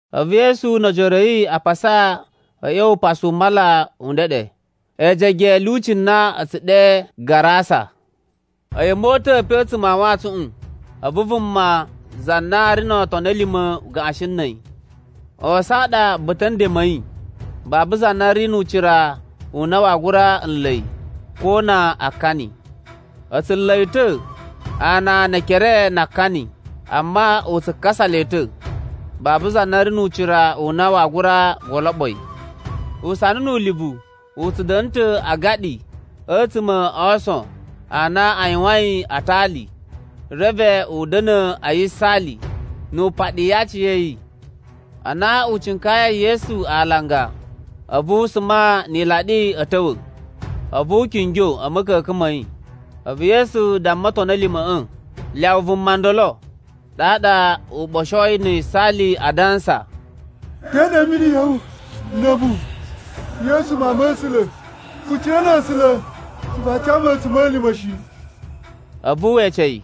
A̱vu Yesu no ojoro a̱ yi a pasa a̱ ꞌya̱wa̱ upasu u mala u ndeɗe, ejege a̱ lyuci na a̱ tsu ɗe Garasa. A̱yi a̱ mota̱a̱ pe a̱tsuma̱ a wantsuꞌun, a̱vu vuma za na ri no otoni a̱ lima̱ u gaꞌashin na̱ a̱yi. Ason a ɗa ba̱ta̱ a̱ nden ma̱ yi. Babu za na ri nu ucira u na waa gura nla̱ yi, ko na akani. A̱ tsu nla̱ yi ta̱ ana ne ekere na akani, amma u tsu kakasa le ta̱. Babu za na ri nu ucira u na waa gura goloɓo yi. Usana nu ulivu u tsu da̱na̱ ta̱ a agaɗi a̱tsuma̱ a ason a na a yuwain a atali. Reve u da̱na̱ a yisaali, na̱ wu paɗi aciya̱yi. Ana u cinkayai Yesu alanga, a̱vu u suma ni ilaɗi a̱ ta̱wa̱, a̱vu u kingyo a̱ ma̱ka̱ka̱n ma̱ yi. A̱vu Yesu damma otoni a̱ lima̱ꞌa̱, “Lyawa vuma ndolo.” Ɗaɗa u ɓoshoi na̱ yisaali a dansa, “Te ɗa imini ya̱ wu na̱ a̱mu, Yesu Mawun ma̱ A̱sula̱? Kucina na̱ A̱sula̱, vaa ca mu a̱tsuma̱lima̱ shi.” A̱vu we ece yi,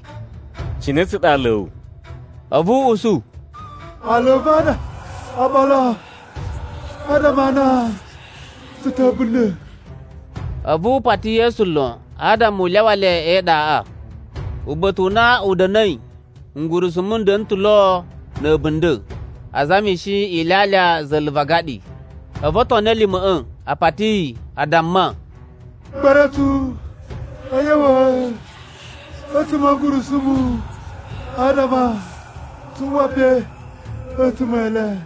“Cine tsa ɗa aala a̱ wu?” A̱vu u usu, “Aala a̱ va̱ a ɗa Oɓolo adama a na tsu ta̱ a̱bunda̱.” A̱vu u pati Yesu lon adama u lyawa le e iɗaꞌa. Uba̱ta̱ u na a̱ da̱na̱i, ngurusumu n da̱na̱ ta̱ lo na̱ a̱bunda̱, a zamishi ilyalya za̱la̱ va agaɗi. A̱vu otoni a̱ lima̱ꞌa̱ a pati yi, a damma, “Gba̱ra̱ tsu a̱ ꞌya̱wa̱ a̱tsuma̱ a̱ ngurusumu, adama tsu uwa pe a̱tsuma̱ e le.”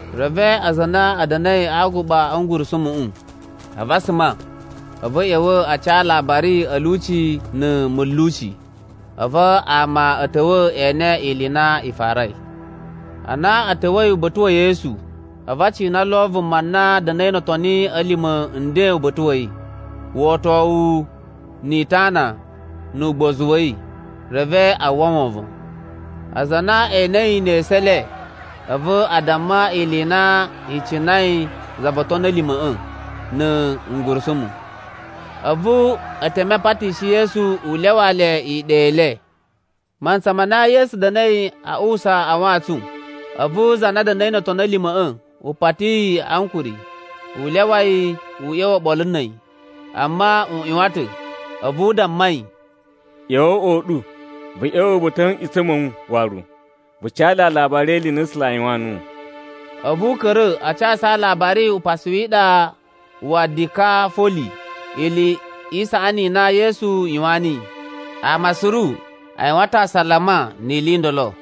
Reve aza a na a̱ da̱na̱i a aguɓa a̱ ngurusumuꞌu, a̱vu a suma, a̱vu a̱ ꞌya̱wa̱ a ca alabari a̱ lyuci na̱ mulyuci. A̱vu ama a̱ ta̱wa̱ e ene ili i na i farai. Ana a̱ ta̱wa̱i uba̱ta̱ wa̱ Yesu, a̱vu a cina lo vuma na da̱na̱i no otoni a̱ lima̱ nden uba̱ta̱ wa̱ yi, uꞌotowu ni itana nu ugbozu wa̱ yi. Reve a uwwa wovon. Aza a na e enei ne esu e le, a̱vu a damma ili i na i cinai za vo otoni a̱ lima̱ꞌa̱ na̱ ngurusumu. A̱vu e teme a patishi Yesu u lyawaa le iɗa i le. Mantsa ma na Yesu da̱na̱i a uwusa a wantsun, a̱vu za na da̱na̱i no otoni a̱ lima̱ꞌa̱ u pati yi ankuri, u lyawa yi u ꞌya̱wa̱ oɓolo na̱ a̱yi. Amma u ꞌyuwan ta̱, a̱vu u damma yi, “ꞌYa̱wa̱ o uꞌwa u ɗu, vu ꞌya̱wa̱ ba̱ta̱ a̱ nꞌutsa̱ ma̱ wu waru, vu ca le alabari e ili i na a̱ A̱sula̱ a yuwaan nuwu.” A̱vu u ka̱ra̱ a casu alabari upasu wi iɗa wa Dikafoli, ili i saꞌani i na Yesu yuwaan niyi. Ama suru a yuwan ta̱ asalama ni ili i ndolo.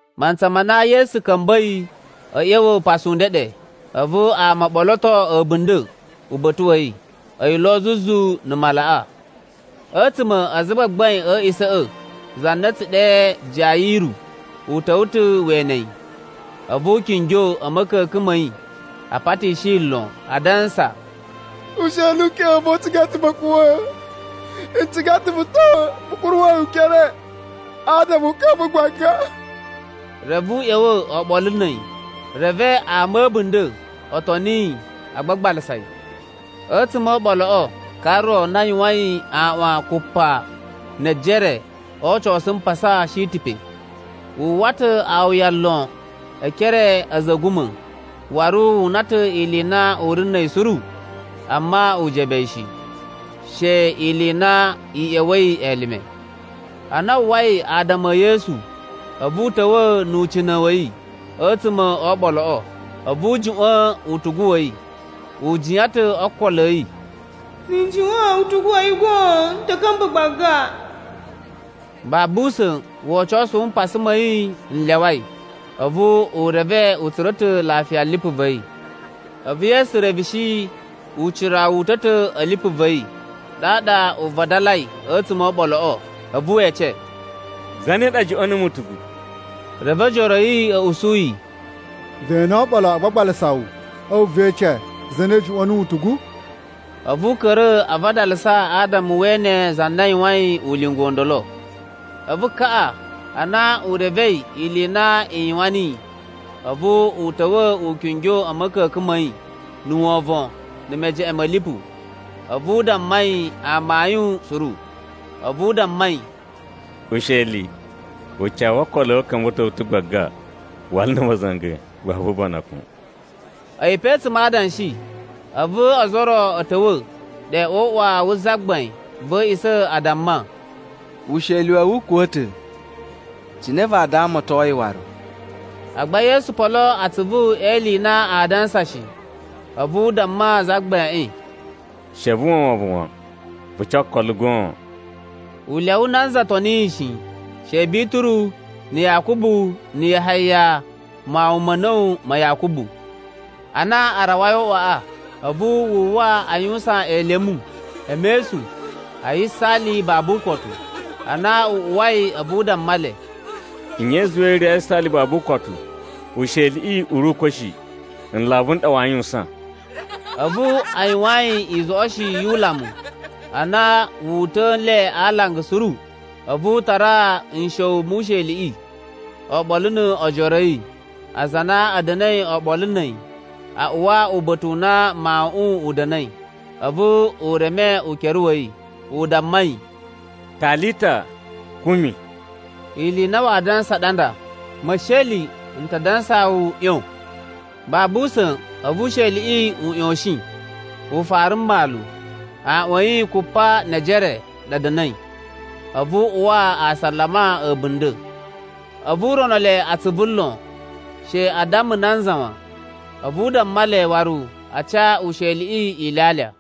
Mantsa ma na Yesu ka̱mba̱i a̱ ꞌya̱wa̱ upasu u ndeɗe, a̱vu ama o ɓoloto a̱bunda̱ uba̱ta̱ wa̱ yi, a̱yi lo zuzu na̱ malaꞌa. A̱tsuma̱ a azagbagbain a̱ a̱a̱ꞌisa̱ꞌa̱, za na a̱ tsu ɗe Jayiru, u ta̱wa̱ ta̱ we ene yi. A̱vu u kingyo a̱ ma̱ka̱ka̱n ma̱ yi, a patishi yi lon, adansa, “Usheli u keꞌen u va̱ u ciga ma̱kuwa̱a̱. N ciga ta̱ vu ta̱wa̱ vu kuruwa̱ yi ukere, adama u ka̱mba̱ gbaga.” Reve u ꞌya̱wa̱ oɓolo na̱ a̱yi, reve ama a̱ a̱bunda̱ o toni yi a gbagbalasa yi. A̱tsuma̱ o oɓoloꞌo, ka ro na yuwain aꞌwan kupa ne ejere o ocosu mpasa shi ta̱ pe. Wu uwwa ta̱ awuya lon e ekere a̱ a̱za̱ a̱ a̱guma̱, waru wu una ta̱ ili i na u ri na̱ a̱yi suru, amma u jebe yi shi, she ili i na i ꞌya̱wa̱i elime. Ana wu uwwai adama e Yesu, a̱vu u ta̱wa̱ nu ucina̱ wa̱ yi a̱tsuma̱ o oɓoloꞌo, a̱vu u juꞌwa̱n utugu wa̱ yi. U jiyan ta̱ o ookolo a̱ yi, “Na̱ n juꞌwa̱n utugu wa̱ yi goon, n ta̱ ka̱mba̱ gbaga.” Babu usa̱n wocosu wu mpasa ma̱ yi n lyawai, a̱vu u reve u tsura̱ ta̱ lafiya lipu va̱ yi. A̱vu Yesu reveshi ucira wu uta̱ ta̱ a̱ lipu va̱ yi. Ɗaɗa u vadalai a̱tsuma̱ o oɓoloꞌo, a̱vu we ece, “Zane ɗa juꞌwa̱n numu utugu?” Reve ojoro a̱ yi a̱ usu yi, “Ve ene oɓolo a gbagbalasa wu, a̱vu ve ece, ‘Zane ɗa juꞌwa̱n nuwu utugu?’” A̱vu u ka̱ra̱ a vadalasa adama we ene za na yuwain ulinga u ndolo. A̱vu kaꞌa, ana u revei ili i na i yuwan niyi, a̱vu u ta̱wa̱ u kingyo a̱ ma̱ka̱ka̱n ma̱ yi na̱ wovon na̱ mejeꞌen ma̱ lipu. A̱vu u damma yi amayun suru. A̱vu u damma yi, “Usheli, ucawu wo okolo a̱ wu u ka̱mba̱to wu ta̱ gbaga. Wala na̱ ma̱za̱nga̱, babu ubanakun.” A̱yi pe a̱tsuma̱ a adanshi, a̱vu ozo o ro a̱ ta̱wa̱ ɗe o uꞌwa wu zagbain va̱ a̱a̱ꞌisa̱ a damma, “Usheli wa̱ wu u kuwa̱ ta̱. Cine vaa damaton yi waru?” Agba Yesu polo atsuvu e ili i na aa dansa shi. A̱vu u damma zagbaiꞌin, “She vu uwwa wovon wan, vu ca okolo goon.” U lyawa nanza toni yi shi, she Bituru, na̱ Yakubu, na̱ Yahaya mawun ma̱ a̱na̱wu ma Yakubu. Ana a rawai o uꞌwaꞌa, a̱vu wu uwwa a yuwusan elemu, e mesun, a yisaali babu ukotu. Ana u uwai, a̱vu u damma le, “Nye i zuwai i ri a yisaali babu ukotu? Usheliꞌi u ri ukwa̱ shi, nlavu n ɗa waa yuwusan.” A̱vu a yuwaan yi izoꞌoshi yu ulamu. Ana wu uta̱a̱ nle a alanga suru, a̱vu u tara nsha̱wu mu usheliꞌi oɓolo no ojoro a̱ yi, aza a na a̱ da̱na̱i oɓolo na̱ a̱yi, a uwa uba̱ta̱ u na mawuꞌun u da̱na̱i. A̱vu u reme ukere wa̱ yi, u damma yi, “Talita kumi.” Ili i na waa dansa ɗa nda, “Mesheli, n ta dansaa wu, ꞌyon.” Babu usa̱n a̱vu usheliꞌi u ꞌyoshin, u fara mmalu. Aꞌwan a̱ yi kupa ne ejere a ɗa a̱ da̱na̱i. A̱vu a uwa asalama a̱bunda̱. A̱vu u rono le atsuvu lon, she a damma nanza wan. A̱vu u damma le waru a ca usheliꞌi ilyalya.